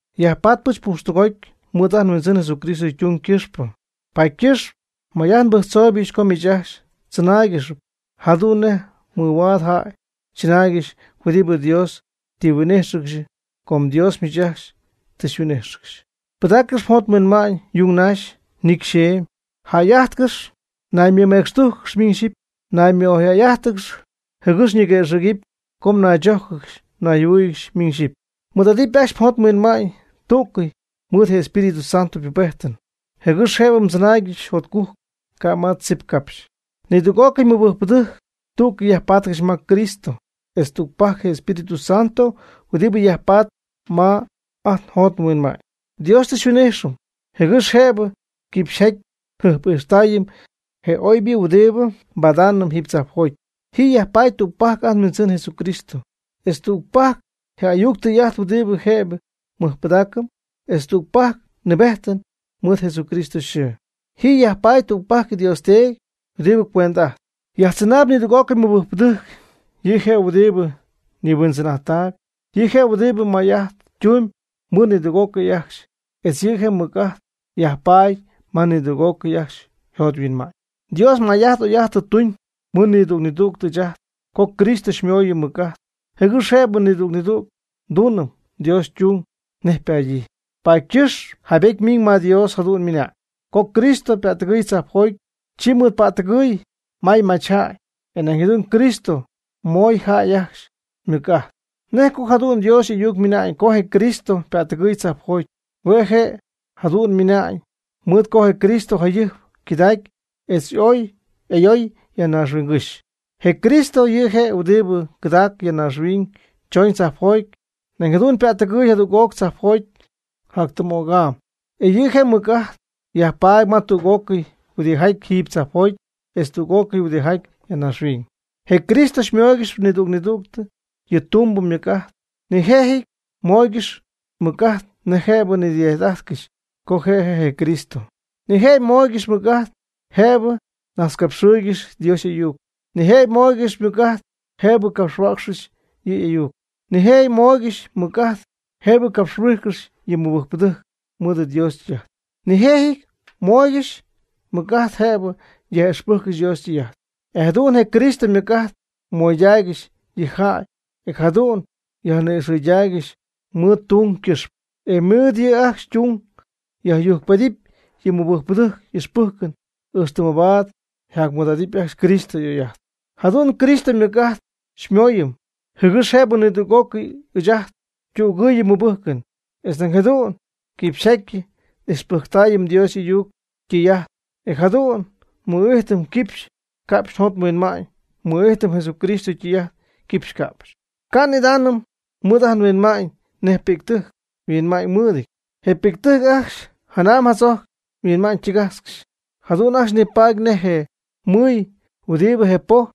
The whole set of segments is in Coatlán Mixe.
Nyajpatpɨch pujxtɨgoty mɨɨd ajt nHuindzɨn Jesucristo ytung ycɨxpɨ. Paady ycɨxp may'ajt nbɨjctzooyɨch co miich ajcxy mdzɨnáaygɨxɨpy jadu'n nej mɨhuaad jäy chɨnaaygɨxy huɨdibɨ Dios tɨ yhuin'íjxɨgɨxy, com Dios miich ajcxy tɨ xyhuin'ijxcɨxy. Pɨdaaccɨx mjot mhuinma'ñ yung naxy, nicy xeemy jäy'ajtcɨxy, naymecxtújcɨgɨx miñ xyipy, naymɨ'oyjäy'ájtɨgɨxy, jɨgɨx ñiguëxɨ̈gɨp co mnaychójcɨgɨxy mnayjɨhuɨ́ɨyɨgɨxy miñ xyipy. Mɨɨd'adɨpy ajcxy mjot mhuinma'ñ tú'cɨy mɨɨd je Espíritu Santo ypubejtɨn jɨgɨx jëbɨ mdzɨnaaygɨxy jotcujc ca' ma tzip capxy. Nidüg'ócɨy mɨbɨjcpɨdɨjc tú'cɨy yajpatcɨxy ma Cristo etz tügpajc Espíritu Santo huɨdibɨ yajpaady ma ajt njot nhuinma'ñ. Dios tɨ xyhuin'ijxɨm, jɨgɨx jëbɨ quipxyjaty njɨjp'ijxtaayɨm je oybɨ huɨdibɨ nbadaanɨm jiiby tzajpjoty. Ji yajpaady tügpajc ajt nHuindzɨn Jesucristo, etz tügpajc je ayuc tɨy'ajt huɨdibɨ jëbɨ nmɨjpɨdaacɨm, etz tügpajc nnɨɨbejtɨm mɨɨd Jesucristo yxɨɨ. Ji yajpaady tügpajc Dios Teedy huɨdibɨ cuendɨ'ajtp yajtzɨnaayb nidüg'ócɨy mɨbɨjcpɨdɨjc. Yɨ' je' huɨdibɨ nihuindzɨn'ajttaayb. Yɨ' je' huɨdibɨ may'ajt tumb mɨɨd nidüg'ócɨy ajcxy, etz yɨ' ymɨc'ajt yajpatp ma nidüg'ócɨy ajcxy yjot yhuinma'ñ. Dios may'ajt oy'ajt tɨ tuñ mɨɨd nidüg nidüg ɨɨch ajt co Cristo xymooyɨm mɨc'ajt, jɨgɨx jëbɨ nidüg nidüg tuunɨpy Dios ytung nej ypadyii. Paady ycɨxp jaybety ymiñ ma Dios jadu'n ymɨna'ñ: Co Cristo ypättɨgɨɨy tzajpjoty, chi ymɨɨdpättɨgɨɨy may machjäy, e nañ jadu'n Cristo moy jäy ajcxy mɨc'ajt (dones). ¿Nej co jadu'n Dios y'ayuc ymɨnañ co je Cristo ypättɨgɨy tzajpjoty? Hue' je' jadu'n ymɨnañ mɨɨd co je Cristo jayɨjp ycɨdacy etz ooy ayooy ya naaxhuiñgɨ́xy. Je Cristo yɨ' je' huɨdibɨ cɨdaac ya naaxhuiñ chooñ tzajpjoty, nañ jadu'n ypättɨgɨɨy jadüg'oc tzajpjoty jactɨm'o'c'am. E yɨ' je' ymɨc'ajt yajpatp ma tüg'ócɨy huɨdijaty jiiby tzajpjoty etz tüg'ócɨy huɨdijaty ya naaxhuiñ. Je Cristo ymooygɨxyp nidüg nidüg yɨ' ytumbɨ mɨc'ajt. Nijëjɨty mooygɨxy mɨc'ajt jëbɨ nidɨy'ajt'ájtɨgɨxy co je' je' je Cristo. Nijëjɨty mooygɨxy mɨc'ajt jëbɨ najtzcapxɨɨygɨxy Dios y'ayuc. Nijëjɨty mooygɨxy mɨc'ajt jëbɨ capxhuäcxcɨxy yɨ' y'ayuc. Nijëjɨty mooygɨxy mɨc'ajt jëbɨ capxhuijcɨxy yɨ mɨbɨjcpɨdɨjc mɨɨd Dios ytɨy'ajt. Nijëjɨty mooygɨxy mɨc'ajt jëbɨ yaj'ixpɨjccɨxy Dios ytɨy'ajt. E jadu'n je Cristo mɨc'ajt moydaaygɨxy yɨ' yjäy, e jadu'n yajni'ixɨydaaygɨxy mɨɨd ytung ycɨxpɨ. E mɨɨd yɨ' ajcxy ytung yjacyujcpedɨpy yɨ mɨbɨjcpɨdɨjc y'ixpɨjcɨn, ixtɨ mabaad jac mɨɨd'adɨpy ajcxy Cristo y'oy'ajtɨn. Jadu'n Cristo mɨc'ajt xymooyɨm, jɨgɨx jëbɨ nidüg'ócɨy ɨɨch ajt ytügɨɨyɨm nmɨbɨjcɨn, etz nañ jadu'n quipxyjaty n'ixpɨjctaayɨm Dios y'ung y'ayuc ytɨy'ajt. E jadu'n nmɨ'ijtɨm cɨxy ca'pxy njot nhuinma'ñ, nmɨ'ijtɨm Jesucristo ytɨy'ajt cɨxy ca'pxy. Ca' n'idaanɨm mɨɨd ajt nhuinma'ñ nej pi'ctɨjc yhuinma'ñ ymɨɨdɨty. Je pi'ctɨjc ajcxy janam jadzojc yhuinma'ñ ytɨgajtzcɨxy. Jadu'n ajcxy nipaady nej je mɨy huɨdibɨ je poj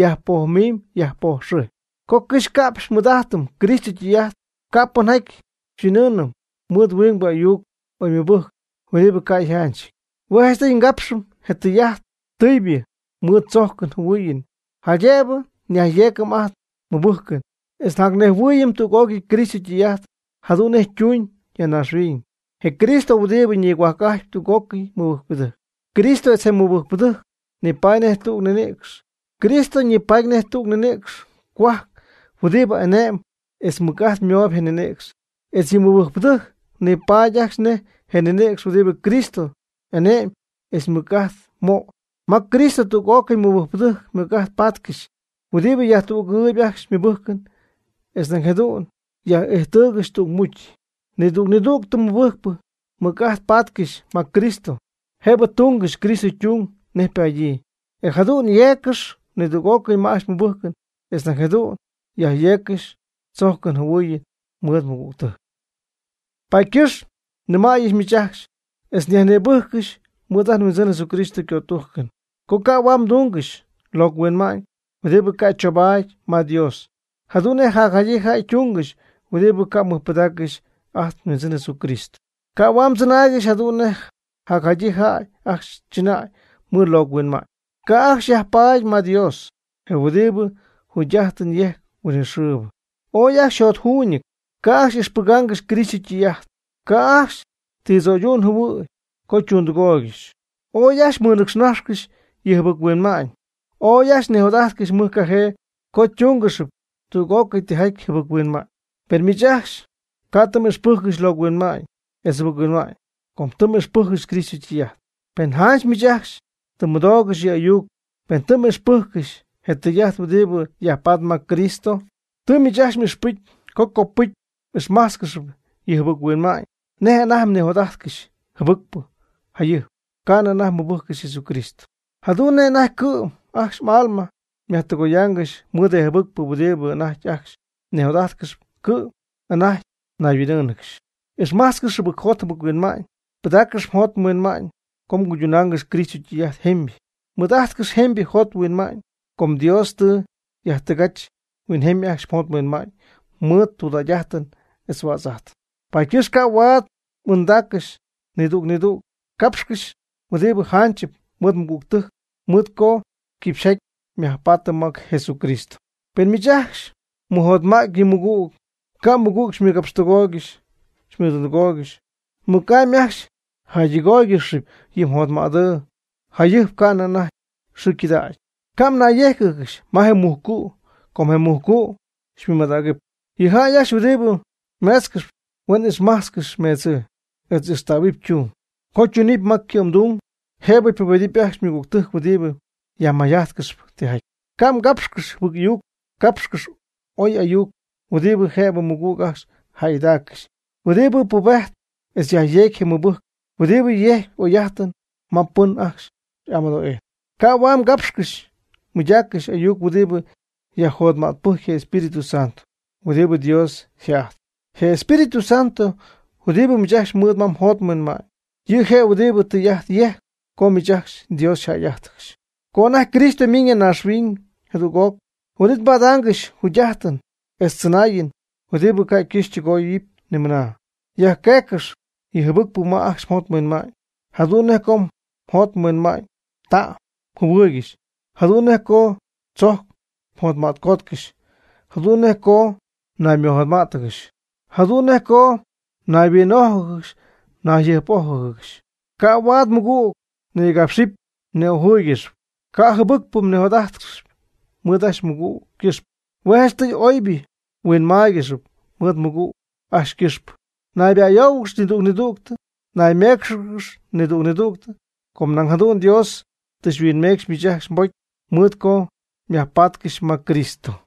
yajpojmimyb yajpojxɨjpy. Co cɨxy ca'pxy nmɨɨd'ajtɨm Cristo ytɨy'ajt, ca' pɨnjaty xyhuin'ɨɨnɨm mɨɨd huing ayuc oymɨbɨjcnɨp huɨdibɨ ca' yjanchɨty. Hue' janchtɨy ngapxɨm je tɨy'ajt tɨybɨ mɨɨd tzojcɨn jɨhuɨɨyɨn, jaydëbɨ njacyeecɨm ajt nmɨbɨjcɨn etz njacnejhuɨɨyɨm tüg'ócɨy Cristo ytɨy'ajt jadu'n nej ytuuñ ya naaxhuiñ, je Cristo huɨdibɨ nigohuajc'ajtp tüg'ócɨy mɨbɨjcpɨdɨjc. Cristo etz je mɨbɨjcpɨdɨjc nipatp nej tüg ninïcx. Cristo ñipatp nej je ninïcx cohuajc huɨdibɨ ane'mb etz mɨc'ajt mooyb je ninïcx. Etz yɨ mɨbɨjcpɨdɨjc ñipatp ajcxy nej je ninïcx huɨdibɨ Cristo y'ane'myb etz mɨc'ajt möy. Ma Cristo tüg'ócɨy mɨbɨjcpɨdɨjc mɨc'ajt patcɨxy huɨdibɨ yajtügɨɨyɨp ajcxy ymɨbɨjcɨn etz nañ jadu'n yaj'íjtɨgɨxy tügmucy. Nidüg nidüg mɨbɨjcpɨ ymɨc'ajt patcɨxy ma Cristo, jëbɨ tungɨxy Cristo ytung nej ypadyii. E jadu'n yeeccɨxy nidüg'ócɨy ma ajcxy ymɨbɨjcɨn, etz nañ jadu'n yajyeeccɨxy chojcɨn yjɨhuɨɨyɨn mɨɨd ymɨgügtɨjc. Paady ycɨxp nnɨmäyɨch miich ajcxy etz nyajnïbɨjccɨxy mɨɨd ajt nhuindzɨn Jesucristo ycötujcɨn, co ca' huaad mdungɨxy locɨ huinma'ñ huɨdibɨ ca' choubaady ma Dios, jadu'n nej jacjadyii jäy ytungɨxy huɨdibɨ ca' mɨjpɨdaaccɨxy ajt nHuindzɨn Jesucristo. Ca' huaad mdzɨnaaygɨxy jadu'n nej jacjadyii jäy ajcxy chɨnäy mɨɨd locɨ huinma'ñ. Ca' ajcxy yajpaady ma Dios, je huɨdibɨ jugy'ajtɨn yejcp huinɨxɨɨbɨ. Ooy ajcxy yjotjuuñɨty, ca' ajcxy ixpɨgaangɨxy Cristo ytɨy'ajt. Ca' ajcxy ti tzo'ydu'n jɨhuɨ̈y co ytundɨgooygɨxy. Ooy ajcxy mɨnɨcxnajxcɨxy yɨ jɨbɨc-huinma'ñ. Ooy ajcxy nijot'ajtcɨxy mɨjcajee co túngɨxɨpy tüg'ócɨy tijaty jɨbɨc-huinma'ñ. Per miich ajcxy ca' tɨ m'ixpɨjccɨxy locɨ huinma'ñ etz jɨbɨc-huinma'ñ co tɨ m'ixpɨjccɨxy Cristo ytɨy'ajt, pen janch miich ajcxy tɨ mmɨdoogɨxy yɨ' y'ayuc, pen tɨ m'ixpɨjccɨxy je tɨy'ajt huɨdibɨ yajpatp ma Cristo. Tɨ miich ajcxy m'ixpɨcy co copɨcy m'ixmájtzcɨxɨpy yɨ jɨbɨc-huinma'ñ nej anajty mnijot'ajtcɨxy jɨbɨcpɨ jayɨjp ca'nɨ anajty mmɨbɨjccɨxy Jesús. Jadu'n nej anajty cɨ'm ajcxy m'alma myajdɨgoyaangɨxy mɨɨd je jɨbɨcpɨ huɨdibɨ anajty ajcxy mnijot'ajtcɨxyp, cɨ'm anajty mnayhuin'ɨ́ɨnɨgɨxy. Ixmajtzcɨx jɨbɨcjot jɨbɨc-huinma'ñ. Pɨdaaccɨx mjot mhuinma'ñ co mguydunaangɨxy Cristo ytɨy'ajt jemybɨ. Mɨɨd'ajtcɨx jemybɨ jot jemybɨ huinma'ñ com Dios tɨ yajtɨgajch huinjemy ajcxy mjot mhuinma'ñ mɨɨd tudägy'ajtɨn etz huädz'ajtɨn. Paady ycɨxp ca'huaad m'ɨɨndaaccɨxy, nidüg nidüg cápxcɨx huɨdibɨ janchɨp mɨɨd mɨgügtɨjc, mɨɨd co quipxyjaty nyajpaatɨm ma Jesucristo. Pen miich ajcxy mmɨjotma'tpy yɨ mmɨgüg, ca' mmɨgüg mɨgapxtɨgooygɨxy mɨdundɨgooygɨxy, mɨc'amy ajcxy mjäydɨgóoygɨxɨpy yɨ mjotmädɨɨ yajɨjp ca'nɨ anajty xɨɨ ycɨdacyñɨ. Ca' mnayyéjcɨgɨxy ma je mujcu' co je mujcu' xymɨmadägɨpy. Yɨ jäy ajcxy huɨdibɨ meetzcɨxp, huen ixmajtzcɨxy meedzɨɨ, etz ijxtähuɨpy ytung. Co ytunɨpy ma cɨ'mdung jëbɨ pubedɨpy ajcxy ymɨgügtɨjc huɨdibɨ yajmayjajtcɨxp tijaty. Ca' mgápxcɨxɨpy jɨbɨc ayuc. Cápxcɨx oy ayuc huɨdibɨ jëbɨ mɨgüg ajcxy jäygɨdaaccɨxy, huɨdibɨ pubejtp etz yajyeegy je mɨbɨjcɨn, huɨdibɨ yejcp oy'ajtɨn ma pɨn ajcxy amɨdo'ijtp. Ca' huaad mgapxcɨxy mmɨydaaccɨxy ayuc huɨdibɨ yajjotmaybɨjcp je Espíritu Santo huɨdibɨ Dios yjë'ajtpy. Je Espíritu Santo huɨdibɨ miich ajcxy mɨɨd ma mjot mhuinma'ñ, yɨ' je' huɨdibɨ tɨy'ajt yejcp co miich ajcxy Dios yjäy'ájtɨgɨxy, co anajty Cristo ymiñ ya naaxhuiñ jadüg'oc huin'it mbadaangɨxy jugy'ajtɨn etz tzɨnaayɨn huɨdibɨ ca' ycɨxɨ́py ytɨgoyɨ́py ni mɨna. Yajqueeccɨx yɨ jɨbɨcpɨ ma ajcxy mjot mhuinma'ñ, jadu'n nej co mjot mhuinma'ñ ta'm mjɨhuɨɨygɨxy, jadu'n nej co tzojc mjotma'tcootcɨxy, jadu'n nej co mnaymɨjotmá'tɨgɨxy, jadu'n nej co mnayhuin'ójɨgɨxy nayjɨjp'ójɨgɨxy. Ca' huaad mmɨgüg mnigapxcɨxy mni'ojɨɨygɨxy. Ca' jɨbɨcpɨ mnijot'ajt'adɨɨtzcɨxy mɨɨd ajcxy mmɨgüg ycɨxpɨ. Hue' janchtɨy oybɨ mhuinmáaygɨxɨpy mɨɨd mmɨgüg ajcxy ycɨxpɨ. Nayba'ayóohuɨgɨxy nidüg nidüg. Nayméecxɨgɨx nidüg nidüg. Com nañ jadu'n Dios tɨ huinmecxy miich ajcxy mbocy mɨɨd co myajpatcɨxy ma Cristo.